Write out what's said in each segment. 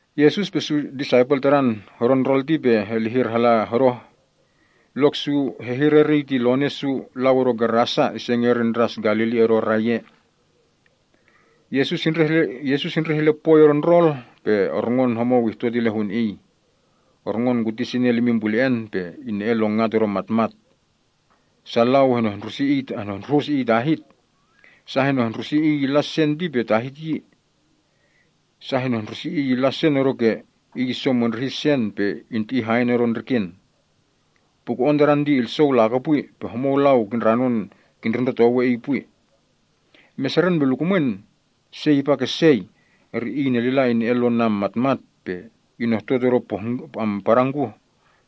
Yesus pe su disaipel Tadan hodo ndrol ti pe helihir hala hodoh. Lok su hehir eriy ti lone’ su lau odo Gerasa, ise ngerin Ndras Galili odo rai ea. Yesus indreh ile pwoi odo ndrol, pe orngon homou ihtot ile hun Iy. Orngon kuti sinel imin pule‑en, pe ine‑en lon ngat odo matmat. Sa lau henehndruhus iy tahit. Sa henehndruhus iy ile sen ti tahit yi. Sa henehndrusi iy illa sen odoke iy isomondrihi sen, pe inti‑i haen odo ndriken. Puko‑on tadan ti ilsou lakopwi, pe homou lau kindranon kindrundrotowe iy pwi. Meseren pe lukumwen sei ihpa ke sei, iy inelila ine‑en lom matmat pe inehtot odo padangkuh,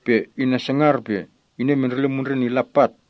pe inesangar pe inemendrele mundren illa pat.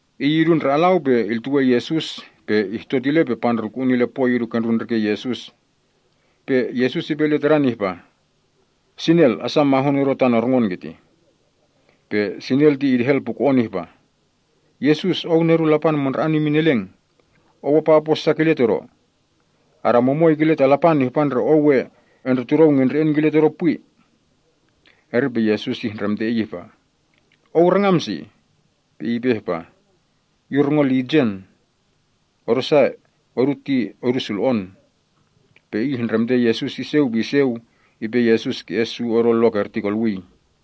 Iy idu ndre alau pe iltuwe Yesus, pe ihtot ile, pe pandrulku‑un ile poi idu kendrun ndriken Yesus. Pe Yesus ipe ile tadan ihpa, “Sinel, asa mahun odo tan orngon kitih.” Pe iy idehel puko‑on ihpa “Yesus! Ou Nedun Lapan Mandra‑an imin Eleng! Ou apa opo sa kile todo? Adamumoi kile ta Lapan ihpa ndre ou we endretudou ngendre‑en kile todo pwi yi.” Eri pe Yesus ihndremte iy ihpa, “Ou rangam si?” Pe iy ipe ihpa, “Yu rongo Lijen, odosa odu ti odu sulo‑on.” Pe iy ihndremte Yesus iseu pe iseu, ipe Yesus ki‑es su odo lok erti kolwii.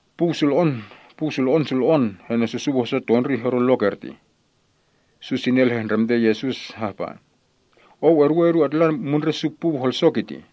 Puu sulo‑on sulo‑on henesusuu hoso tondrih odo lok ertih. Su sinel hehndremte Yesus hahpa, “Ou eduwe odu atla mundre’ su puu holso kitih.”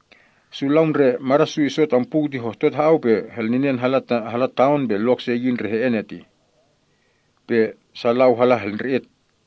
Su lau ndre mada’ su iso tam puu ti hohtot ha‑au pe helninen hala taon pe lok se yi ndre he‑en ertih. Pe sa lau hala helndre‑et.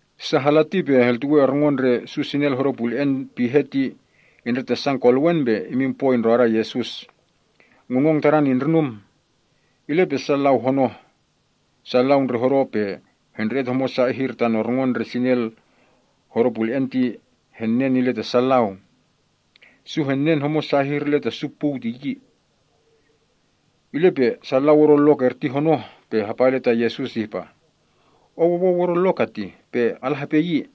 Sa hala ti pe heltuwe orngon ndre su sinel hodo pule‑en pihe ti indretasan kolewen pe imin poi ndroda Yesus. Ngungong tadan indrinum. Ile pe sa lau honoh. Su lau ndre hodo pe hendre‑et homosa ihir tan orngon ndre sinel hodo pule‑en ti henen ile ta sa lau. Su henen homosa ihir ile ta su puu ti yi. Ile pe sa lau odo lok erti honoh pe hapa ile ta Yesus ihpa, “Ou owou odo lok keti pe ala hepe yi.”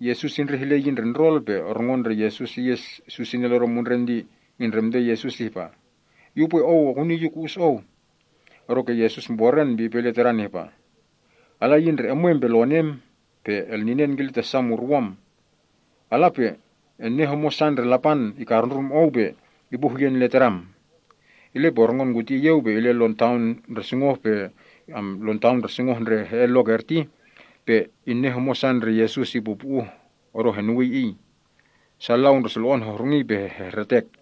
Yesus indreh ile yi ndre ndrol, pe orngon ndre Yesus iyes su sinel odo mundren ti ihndremte Yesus ihpa, “Yu upwe Ou ekuni yu ku‑us Ou.” Odoke Yesus mboren pe ipe ile tadan ihpa, “Ala yi ndre emwem pe lonem, pe elninen kile ta su murwom. Ala pe enen homosa ndre Lapan ikarundrum ou pe ipu huyen ile tadam.” Ile pe orngon kuti iyeu, pe ile lon taon ndre sungoh ndre he‑en lok erti, pe inen homosa ndre Yesus ipupu‑uh odo henuwii iy. Sa lau ndre sulo‑on hohrungii pe hehretek.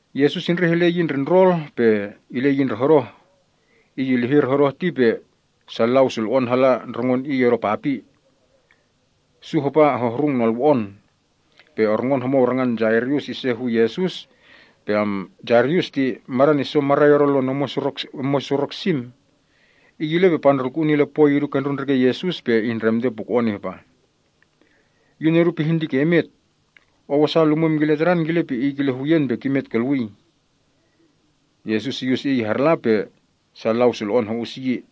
Yesus indreh ile yi ndre ndrol pe ile yi ndre hodoh. Iy ilihir hodoh ti pe sa lau sulo‑on hala ndrongon iy odo papi. Su hapa hohrung nolwo‑on. Pe orngon homou rangan Jairus ise hu Yesus. Jairus ti madan iso marai odo lon omwen surok sim. Iy ile pe pandrulku‑un ile poi idu kendrun ndriken Yesus, pe ihndremte puko‑on ihpa, “Yu nedu pihin ke imet. Ou asa lumwem kile tadan, kile pe iy kile huyen pe kimet kolwii.” Yesus iyus iy harla, pe sa lau sulo‑on ho‑us yi.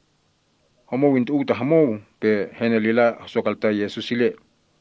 Homou intu‑uw ta homou, pe henelila hosokaltan Yesus ile.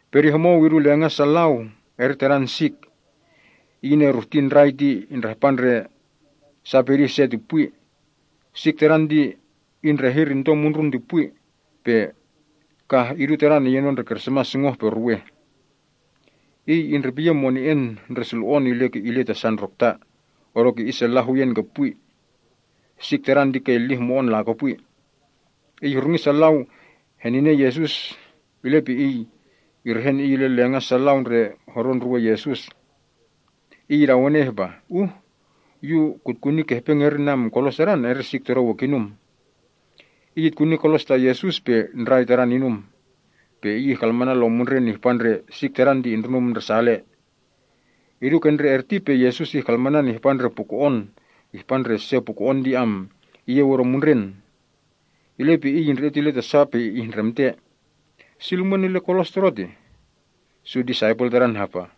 Pedih homou idu lenga’ sa lau, eri tadan sik. Iy ineruhti ndrai ti indrahpa ndre sa pedih se ti pwi. Sik tadan ti indrehir into mundrun ti pwi, pe kah idu tadan iyenon ndre krismas sungoh-pe-ruweh. Iy indrepiyen mone‑en ndre sulo‑on ile ta sa ndrokta, odoke isella huyen ke pwi. Sik tadan ti ke illih mo‑on lakopwi. Iy ihrungi sa lau heninen Yesus, ile pe iy irehen iy ile lenga’ sa lau ndre hodo ndruwen Yesus. Iy idawene ihpa, “Uh yu kutkuni ke hepe ngerin kolos Tadan, eri sik todo we kinum.” Iy itkuni kolos ta Yesus, pe ndrai tadan inum. Pe iy ihkalmanan lom mundren ihpa ndre sik tadan ti indrinum ndresale. Idu ke ndre erti pe Yesus ihkalmanan ihpa ndre se puko‑on ti iyeu odo mundren. Ile pe Iy indre‑et ile ta sa pe ihndremte, “Si lumwen ile kolos Todo tih?” Su disaipel Tadan hapa ihpa,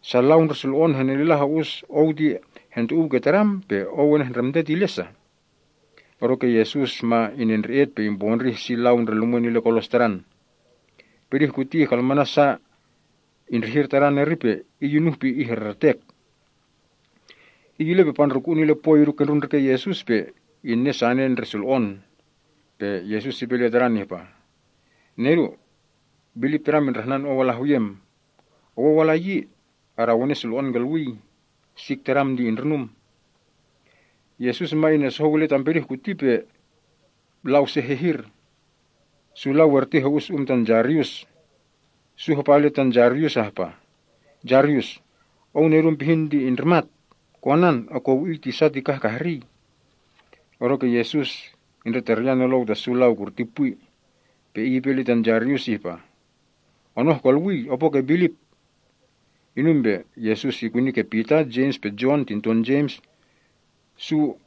“Sa lau ndre sulo‑on henelila ho‑us Ou ti hentu‑uw ke Tadam, pe Ou enehndremte ile sa?” Odoke Yesus ma inendre‑et pe impondrih si lau ndre lumwen ile kolos Tadan. Pedih kuti ihkalmanan sa indrihir tadan eri pe iy inuh pe ihreretek. Iy ile pe pandrulku‑un ile poi idu kendrun ndriken Yesus, pe inen sane ndre sulo‑on. Pe Yesus ipe ile tadan ihpa, “Nedu, bilip tadam indrahnan ou ala huyem. Owou ala yi. Adawene sulo‑on kolwii. Sik tadam ti indrinum.” Yesus ma inesohou ile tam pedih kuti pe lau se hehir. Su lau erti ho‑us um tan Jairus. Su hapa ile tan Jairus ihpa, “Jairus, ou nedum pihin ti indrimat. Konan, ekowi‑iy tisa ti kah kahrii.” Odoke Yesus indretaryan nolou ta su lau kurti pwi. Pe Iy ipe ile tan Jairus ihpa, “Onoh kolwii. Opo ke bilip.” Inum pe Yesus ikuni ke Pita, Jems, pe Jon tinton Jems, pe su ho‑us Iy.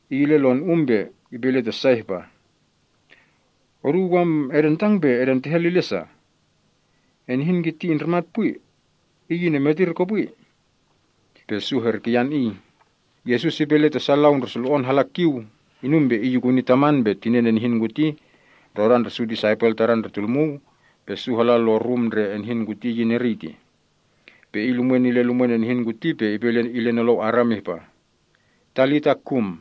Iy ile lon um pe ipe ile ta sa ihpa, “Oduu edentang pe edentehel ile sa? Enihin kiti indrimat pwi. Iy inemetir kopwi.” Pe su herikiyan Iy. Yesus ipe ile ta sa lau ndre sulo‑on hala kiu. Inum pe Iy ikuni taman pe tinen enihin kuti, ndrodan ndre su disaipel Tadan ndre tulmuu, pe su hala lon rum ndre enihin kuti iyin eriy tih. Pe Iy lumwen ile lumwen enihin kuti pe ipe ile nolou Aram ihpah, “Talita, kum.”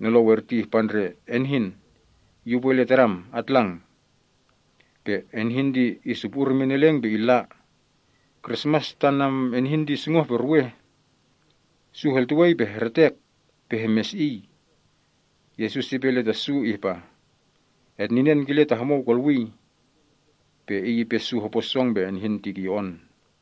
Nolou erti ihpa ndre, “Enehin, yu upwe ile tadam, atlang!” Pe enihin ti isupu‑ur imin eleng pe illa. Krismas tan enihin ti sungoh-pe-ruweh. Su heltuwei pe hehretek pe hemesi‑iy. Yesus ipe ile ta su ihpa, “Etninen kile ta homou kolwii.” Pe Iy ipe su hopo song pe enihin ti kiyo‑on.